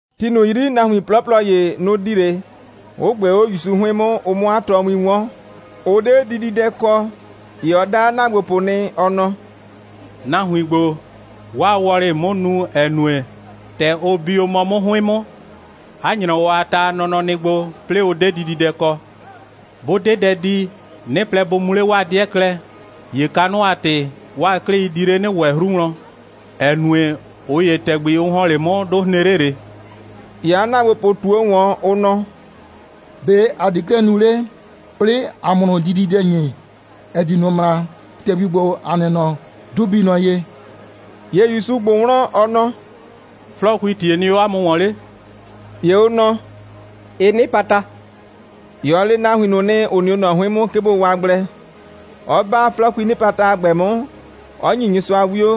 Ti ꞊nʋ 'yri, nahuin 'plɔplɔ ‑ye, nʋ‑ di 'le, 'ʋ ꞊gbee 'o ‑Yusu 'hʋɩn 'mʋ, ʋ 'mʋ 'a tɔɔwin 'wɔn. Ʋ 'de dididɛ kɔ. ‑Ye ɔ da 'a ‑naagbopʋ nɩ, ɔ nɔ: «Nahuin ‑gbo, 'waa wɔlɩ‑ɩ 'mʋ nu, ‑ɛ nue, ‑tɛ ʋ bi o mɔ 'mʋ 'hʋɩn 'mʋ, 'a ‑nyrɔwɔ a ta a nɔnɔ nɩ gbo, 'plɩɩ ʋ 'de dididɛ kɔ. 'Bʋ 'de dɛ di, 'nɩ plɛ, bʋ mu 'le 'waa 'dɩɛ klɛ, ‑ye kanʋ a ‑tɩ 'waa 'klɩi di 'le 'nɩ ‑wɛ 'hru wlɔn, ‑ɛ nue, ꞊ʋ ‑ye, ‑tɛgbi ʋ ‑hɔn 'le 'mʋ, 'dʋ hren 'le ꞊le.» ‑Ye 'a ‑naagbopʋ ꞊tuo ‑wɔn, ʋ nɔ: «‑Be' ‑a di 'klɛɛ nu 'le, 'plɩɩ ‑a 'mʋ ꞊nʋ dididɛ ‑nyi, ‑ɛ di ꞊nʋ ꞊mraa. ‑Tɛgbi ‑gbo, ‑a nɩ mɔ, 'dʋ bii nɔ ye.» ‑Ye ‑Yusu ꞊gbʋ wlɔn, ɔ nɔ: «'Flɔɔkuii ‑tie nɩ 'o 'a mʋ ‑wɔn 'le?» ‑Ye ʋ nɔ: «Ɩ 'nɩpata.» ‑Ye ɔ le nahuin ꞊nʋ nɩ, ‑ʋ nɩ 'o ꞊nɔ 'hʋɩn 'mʋ, 'ke bʋ waa gblɛ, 'ɔ 'ba 'flɔɔkuii 'nɩpata a ‑gbɛ 'mʋ, 'ɔ ‑nyi Nyɩsʋa 'wio,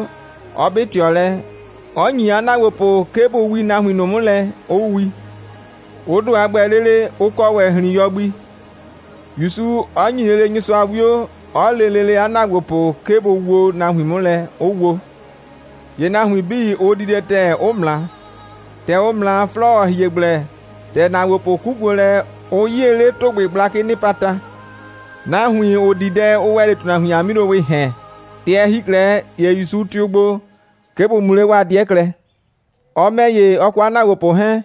'ɔ 'bɩ ꞊tɩɔ lɛ, 'ɔ ‑nyi 'a ‑naagbopʋ, 'ke bʋ wii nahuin 'mʋ lɛ, 'ʋ wi. Ʋ ‑do a ‑gbɛ lele, ʋ kɔ ‑wɛ ‑hrin.yɔ gbi, ‑Yusu 'ɔ ‑nyi lele Nyɩsʋa 'wio, 'ɔ le lele 'a ‑naagbopʋ, 'ke bʋ woo nahuin 'mʋ lɛ, 'ʋ wo. ‑Ye nahuin 'bii, ʋ di dɛ ‑tɛɛ, 'ʋ ꞊mra. ‑Tɛ ʋ ꞊mra, 'flɔɔ, ‑ɔ hie gblɛ, ‑tɛ ‑naagbopʋ 'kukuo lɛ, ʋ 'yie 'le ‑tʋgbɩ gblakɩɩ 'nɩpata. Nahuin, ‑ʋ di dɛ, ʋ ‑wɛ 'le ‑tʋnahuin a 'milowɩɩ ‑hɛn. ‑Tɛ ɛ ‑hi 'klɛɛ, ‑ye ‑Yusu tɩʋ gbo, 'ke bʋ mu 'le 'waa 'dɩɛ klɛ. Ɔ ‑mɛ ‑ye, ɔ kɔ 'a ‑naagbopʋ 'hɛɛn,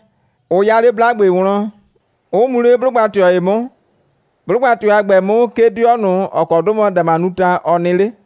ʋ 'ya 'le 'blagbe wlɔn, 'ʋ mu 'le 'blʋgba꞊tɩɔ ‑ye 'mʋ. 'Blʋgba꞊tɩɔ a ‑gbɛ 'mʋ, 'ke 'dɩɔ ꞊nʋ, ‑ɔ kɔ 'dʋ mɔ Damanuta, ɔ nɩ 'le.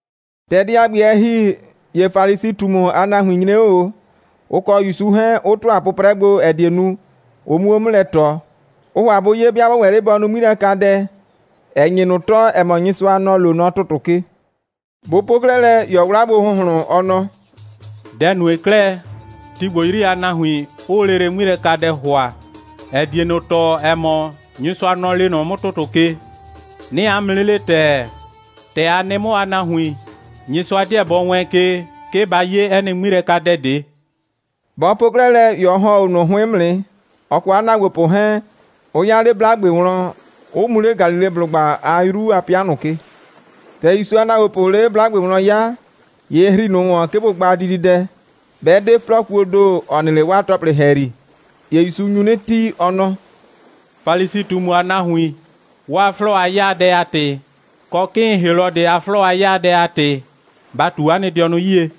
‑Tɛ dɛ a ‑gbɛ, ɛ ‑hi, ‑ye Falisi꞊tumu a nahuin nyre 'o ꞊o, ʋ kɔ ‑Yusu 'hɛɛn, 'ʋ ‑tʋa 'pʋprɛ gbo, ‑ɛ die nu, ʋ 'muo 'mʋ lɛ ꞊tɔ. Ʋʋ ‑hʋa bʋ 'ye, 'bɩa 'bɔ ‑wɛ 'le bɔ nu 'ŋmilɛkadɛ, ‑ɛ nye ꞊nʋ tɔɔ, ‑ɛ mɔ, Nyɩsʋa, nɔ‑ loo nɔ ‑tʋtʋ ke. Bʋ po 'klɛɛ lɛ, ‑ye ɔ 'wla gbo ‑hʋnhlʋn, ɔ nɔ: «Dɛ‑ nue 'klɛɛ, ti ‑gbo 'yri a nahuin 'ʋʋ lele 'ŋmilɛkadɛ ‑hʋa, ‑ɛ die ꞊nʋ tɔɔ, ‑ɛ mɔ, Nyɩsʋa, nɔ‑ lee nɔ 'mʋ ‑tʋtʋ ke. 'Nɩɩ 'a mʋ 'nɩ le ‑tɛɛ: ‑Tɛ a nɩ 'mʋ a nahuin, Nyɩsʋa 'deɛ bɔ wɛɛn ke, 'ke ba 'ye 'ɛ nɩ 'ŋmilɛkadɛ ꞊de.» Bɔ po 'klɛɛ lɛ, ‑ye ɔ ‑hɔn 'o ꞊nʋ 'hʋɩn 'mʋ nɩ, ɔ kɔ 'a ‑naagbopʋ 'hɛɛn, 'ʋ 'ya 'le 'blagbe wlɔn, 'ʋ mu 'le Galileblʋgba a 'yru a 'pɩa ꞊nʋ ke. ‑Tɛ ‑Yusu a ‑naagbopʋʋ 'le 'blagbe wlɔn 'ya, ‑ye ɩ ‑hri ꞊nʋ ‑wɔn, 'ke bʋ gba dididɛ, 'bɛ 'de 'flɔɔkuoo ‑do, ‑ɔ nɩ 'le 'waa ‑tɔplɩ ‑hɛyri. ‑Ye ‑Yusu nyu 'nɩ tii, ɔ nɔ: «Falisi꞊tumu a nahuin, 'waa 'flɔɔ a 'yaadɛ a ‑tɩ, kɔ 'kɩɩn Helɔdɩ a 'flɔɔ a 'yaadɛ a ‑tɩ, ba ꞊tu 'a nɩ dɩɔnʋ 'yie!»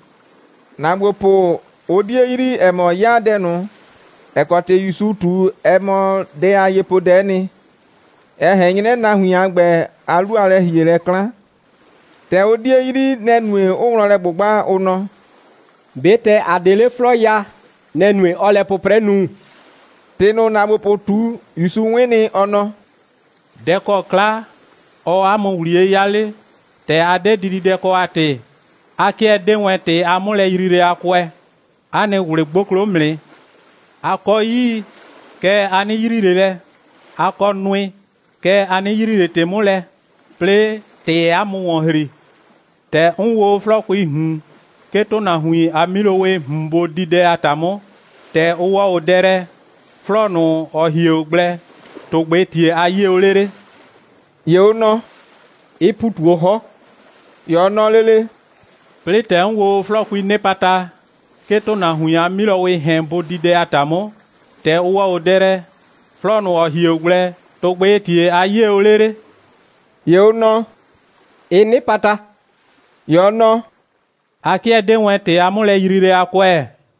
‑Naagbopʋ, ʋ 'die yrii, ‑ɛ mɔ, 'yaadɛ ꞊nʋ, ‑ɛ kɔ ‑tɩ ‑Yusu ꞊tu, ɛ mɔ dɛ a yepoodɛ'ɛ nɩ, ‑ɛ ꞊hɛn 'nyrɛ nahuin a ‑gbɛ a 'lu a lɛ‑hielɛ 'klan. ‑Tɛ ʋ 'die yrii, nɛ‑ nue, 'ʋʋ wlɔn lɛ ꞊gbʋgba, ʋ nɔ: «꞊Be ‑tɛ ‑a 'de 'le 'flɔɔ ya, nɛ‑ nue, 'ɔɔ lɛ 'pʋprɛ nu?» ‑Tɩ ꞊nʋ, ‑naagbopʋ ꞊tu, ‑Yusu 'wɩn nɩ, ɔ nɔ: «Dɛ‑ kɔ 'kla, ɔɔ 'a mʋ ‑wliye 'ya 'le, ‑tɛ ‑a 'de kɛ dididɛ kɔ a ‑tɩ? A 'kɩɛ 'dee wɛn ‑tɩ a 'mʋlɛyriilɛ a kʋɛ. 'A nɩ ꞊wlɩ 'gboklo 'mʋ nɩ. A kɔ 'yii, kɛɛ, a 'nɩ yrii ꞊le lɛ, 'a kɔ nʋɩ, kɛɛ, a 'nɩ yrii ꞊le ‑tɩ 'mʋ lɛ. 'Plɩɩ, ‑tɩɩ 'a mʋ ‑wɔn ‑hri. ‑Tɛ 'n wloo o 'flɔɔkuii ꞊hun, 'ke ‑tʋnahuin a 'milowɩɩ ꞊hun bʋ di dɛ a ‑ta 'mʋ, ‑tɛ ʋ ‑wɔ o dɛ lɛ, 'flɔɔ ꞊nʋ, ‑ɔ hie o gblɛ, ‑tʋgbɩɩ ‑tie a 'yie o 'le 'le?» ‑Ye ʋ nɔ: «Ɩ ‑pu ꞊tu 'o 'hɔn.» ‑Ye ɔ nɔ lele: «'Plɩɩ, ‑tɛ 'n wloo o 'flɔɔkuii 'nɩpata, 'ke ‑tʋnahuin a 'milowɩɩ ‑hɛn bʋ di dɛ a ‑ta 'mʋ, ‑tɛ ʋ ‑wɔ o dɛ lɛ, 'flɔɔ ꞊nʋ, ‑ɔ hie o gblɛ, ‑tʋgbɩɩ ‑tie a 'yie o 'le 'le?» ‑Ye ʋ nɔ: «Ɩ 'nɩpata.» ‑Ye ɔ nɔ: «A 'kɩɛ 'dee wɛn ‑tɩ a 'mʋlɛyriilɛ a kʋɛ.»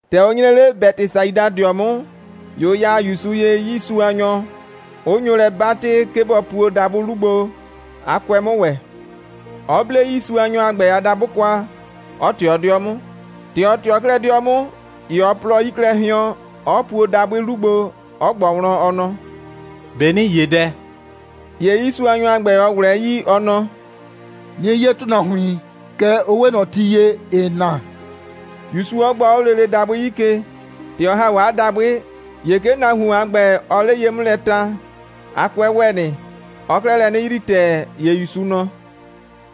‑Tɛ ʋ nyre 'le Bɛtɩsaidadɩɔ 'mʋ, ‑ye ʋ ya ‑Yusu ye 'yiisuanyɔ, 'ʋ nyo lɛ 'batɩ, 'ke bɔ puo dabʋɩ 'lu gbo, 'a 'kʋɛ 'mʋ ‑wɛ, 'ɔ 'ble 'yiisuanyɔ a ‑gbɛ a dabʋ kwa, 'ɔ ꞊tɩɔ 'dɩɔ 'mʋ. ‑Tɛ ɔ ꞊tɩɔ 'klɛɛ 'dɩɔ 'mʋ, ‑ye ɔ plʋɔ 'yi klɛ hɩɔn, 'ɔ puo dabʋɩ 'lu gbo, 'ɔ ꞊gbɔ wlɔn, ɔ nɔ: «꞊Be ‑nɩɩ 'ye dɛ?» ‑Ye 'yiisuanyɔ a ‑gbɛ, ɔ ꞊wlɛɛ 'yii, ɔ nɔ: «'Nɩɩ 'ye ‑tʋnahuin, kɛɛ, ʋ 'we ꞊nɔ ti ye, ‑ɩɩ na,» ‑Yusu 'ɔ gbɔ 'o lele dabʋɩ 'yi ke. ‑Tɛ ɔ ‑ha 'o 'a dabʋɩ, ‑ye 'ke nahuon a ‑gbɛ, ɔɔ 'le ye 'mʋ lɛ ta. 'A 'kʋɛ ‑wɛ nɩ. Ɔɔ 'klɛɛ lɛ 'nɩ yrii ‑tɛɛ. ‑Ye ‑Yusu nɔ: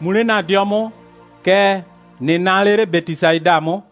«Mu 'le ‑na 'dɩɔ 'mʋ, kɛɛ, ꞊nɩ naa 'le 'le Bɛtɩsaida 'mʋ.»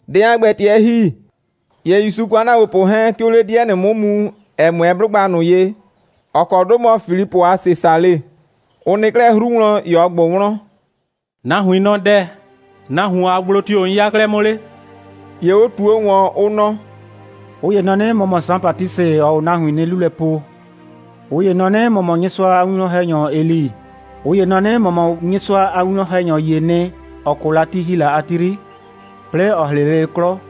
Dɛ a ‑gbɛ, ‑tɛ ɛ ‑hi, ‑ye ‑Yusu kɔ 'a ‑naagbopʋ 'hɛɛn, 'ke ʋʋ 'le 'dɩɛ ꞊nʋ 'mʋ mu, ‑ɛ 'mʋɛɛ 'blʋgba ꞊nʋ ye, ‑ɔ kɔ 'dʋ mɔ Filipʋ a Sesale. Ʋ nɩ 'klɛɛ 'hru wlɔn, ‑ye ɔ ꞊gbʋ wlɔn: «Nahuin nɔ dɛ‑, nahuon a gblo tio‑ 'n 'ya 'klɛɛ 'mʋ 'le?» ‑Ye ʋ ꞊tuo ꞊wɔn, ʋ nɔ: «꞊Ʋ ‑ye nɔ 'nɩ, ‑mɔ mɔ Saan Batisɩ, ‑ɔɔ o nahuin 'nie 'lu lɛ po. ꞊Ʋ ‑ye nɔ 'nɩ, ‑mɔ mɔ Nyɩsʋa a winwlɔn‑hɛnyɔ Eli. ꞊Ʋ ‑ye nɔ 'nɩ, ‑mɔ mɔ Nyɩsʋa a winwlɔn‑hɛnyɔ ‑yee nɩ, ‑ɔ 'kʋ la, ti ‑hi la a ti 'yri, 'plɩɩ ‑ɔ 'hrɩ lele 'klɔ.»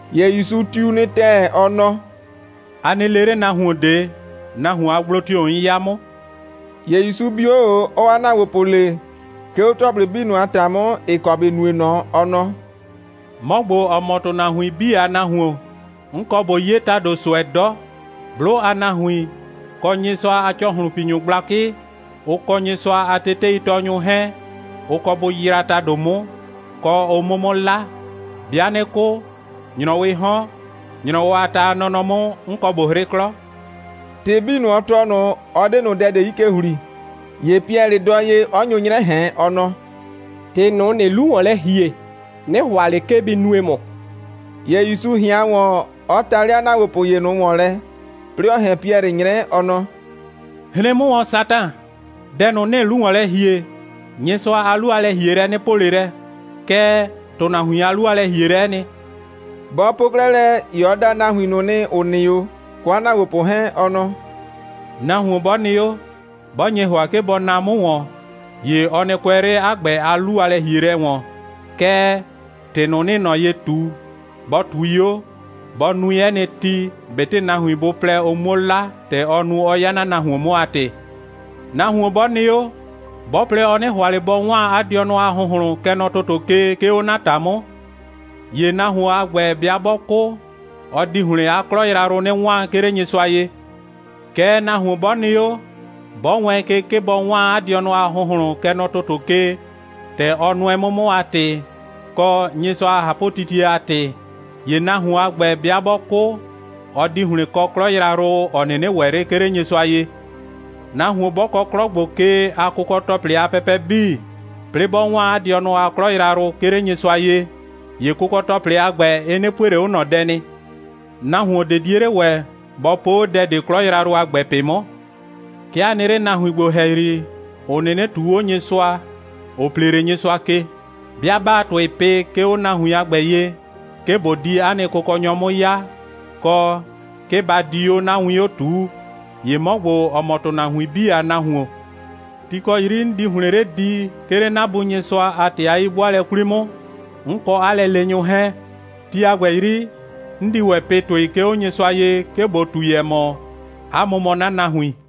‑Ye ‑Yusu tiu nɩ ‑tɛɛ, ɔ nɔ: «A nɩ le 'le nahuon ꞊de, nahuon a gblo tio‑ 'n 'ya 'mʋ!» ‑Ye ‑Yusu bi 'o ꞊o, 'ɔɔ 'a ‑naagbopʋ le, 'ke 'o ‑tɔplɩ 'bii a ‑ta 'mʋ, ‑ɩ kɔ ‑bɩ nue ꞊nɔ, ɔ nɔ: «'Mɔ ‑gbo, ‑ɔ mɔ ‑tʋnahuin 'bii a Nahuon, 'n kɔ ꞊bo 'ye ‑tado ꞊sʋɛ 'dɔ. 'Blʋ a nahuin, kɔ Nyɩsʋa a ‑cɔhlʋnpinyʋ gblakɩ, ʋ kɔ Nyɩsʋa a teteitɔɔnyʋ 'hɛɛn, ʋ kɔ bʋ yraa ‑tado 'mʋ, kɔ, ʋ 'mʋ 'mʋ 'la. 'Bɩa 'nɩ 'kʋ, ‑nyrɔwɩɩ 'hɔn, ‑nyrɔwɔ a ta a nɔnɔ 'mʋ, 'n kɔ ꞊bo 'hrɩ 'klɔ.» ‑Tɩ 'bii ꞊nʋ, ɔ tɔɔ ꞊nʋ, ɔ 'de ꞊nʋ dɛ ꞊de 'yi ke ‑hli. ‑Ye Piɛlɩ dɔɔ ye, 'ɔ nyo 'nyrɛ ꞊hɛn, ɔ nɔ: «‑Tɩ ꞊nʋ, ‑nɩɩ 'lu ‑wɔn lɛ ‑hie, 'nɩ ‑hʋa ꞊le, 'ke bɩ nue ‑mʋ.» ‑Ye ‑Yusu ꞊hɩan ‑wɔn, 'ɔ ta 'le 'a ‑naagbopʋ ‑ye ꞊nʋ ‑wɔn lɛ, 'plɩɩ 'ɔ ꞊hɛn Piɛlɩ 'nyrɛ, ɔ nɔ: «Hren 'mʋ ‑wɔn, Satan! Dɛ ꞊nʋ, ‑nɩɩ 'lu ‑wɔn lɛ ‑hie, Nyɩsʋa a 'lu a lɛ‑hielɛ 'nɩ po ꞊le lɛ, kɛɛ, ‑tʋnahuin a 'lu a lɛ‑hielɛ'ɛ nɩ.» Bɔ po 'klɛɛ lɛ, ‑ye ɔ da nahuin ꞊nʋ nɩ, ‑ʋ nɩ 'o, kɔ 'a ‑naagbopʋ 'hɛɛn, ɔ nɔ: «Nahuon 'bɔ nɩ 'o, 'bɔ nye ‑hʋa, 'ke bɔ naa 'mʋ ‑wɔn, ‑ye ɔ nɩ kʋɛ 'le 'a ‑gbɛ a 'lu a lɛ‑hielɛ ‑wɔn, kɛɛ, ‑tɩ ꞊nʋ, 'nɩɩ ꞊nɔ ye ꞊tu, bɔ ꞊tui 'o, bɔ nui 'ɛ nɩ ti, ꞊betɩ nahuin bʋ plɛ, ʋ 'muo 'la, ‑tɛ ɔ nu, 'ɔ 'ya 'na nahuon 'mʋ a ‑tɩ. Nahuon 'bɔ nɩ 'o, 'bɔ plɛ, ɔ 'nɩ ‑hʋa ꞊le bɔ 'waan 'a dɩɔnʋ a ‑hʋnhlʋn, kɛ nɔ ‑tʋtʋ ke, 'ke 'o 'na ‑ta 'mʋ, ‑ye nahuon a ‑gbɛ 'bɩa 'bɔ 'kʋ, ɔ di ‑hlɩn 'a 'klɔ yrayrʋ 'nɩ 'waan, 'ke 'le Nyɩsʋa ye. Kɛɛ, nahuon 'bɔ nɩ 'o, 'bɔ wɛɛn ke, 'ke bɔ 'waan 'a dɩɔnʋ a ‑hʋnhlʋn, kɛ nɔ ‑tʋtʋ ke, ‑tɛ ɔ nʋɛ 'mʋ 'mʋ a ‑tɩ, kɔ, Nyɩsʋa a ꞊hapʋtitie a ‑tɩ, ‑ye nahuon a ‑gbɛ, 'bɩa 'bɔ 'kʋ, ɔ di ‑hlɩn kɔ 'klɔ yrayrʋ, ‑ɔ 'nɩnɩ ‑wɛ 'le, 'ke 'le Nyɩsʋa ye. Nahuon 'bɔ kɔ 'klɔ ‑gbo ke a kʋkɔ‑tɔplɩ a pɛpɛ 'bii, 'plɩɩ 'bɔ 'waan 'a dɩɔnʋ a 'klɔ yrayrʋ, 'ke 'le Nyɩsʋa ye, ‑ye kʋkɔ‑tɔplɩ a ‑gbɛ, ɩ 'nɩ pue ꞊le 'o ꞊nɔ dɛ nɩ. Nahuon ꞊de 'die 'le ‑wɛ, bɔ po 'o dɛ ꞊de 'klɔ yrayrʋ a ‑gbɛ ꞊pɩ 'mʋ. 'Ke a nɩ 'le nahuin ‑gbo ‑hɛyri, ‑ʋ 'nɩnɩ ꞊tuu 'o Nyɩsʋa, ‑ʋ plee 'le Nyɩsʋa ke. 'Bɩa 'baa ‑tʋɩ pɩ, 'ke 'o nahuin a ‑gbɛ ye, 'ke ꞊bo di 'a nɩ Kʋkɔnyɔ 'mʋ 'ya, kɔ, 'ke ba di 'o 'na win 'o ꞊tuu, ‑ye 'mɔ ‑gbo, ‑ɔ mɔ ‑tʋnahuin 'bii a Nahuon, ti ‑kɔ ti 'yri 'n di ‑hlɩn 'le di, 'ke 'le 'na Bu Nyɩsʋa a ‑tɩ a 'yi'bʋaalɛ 'kwli 'mʋ, 'n kɔ 'a lɛleenyʋ 'hɛɛn, ti a ‑gbɛ 'yri, 'n di ‑wɛ pɩ ‑tʋɩ, 'ke 'o Nyɩsʋa ye, 'ke ꞊bo ꞊tui, ‑ɛ mɔ, 'a mʋ mɔ 'na nahuin.»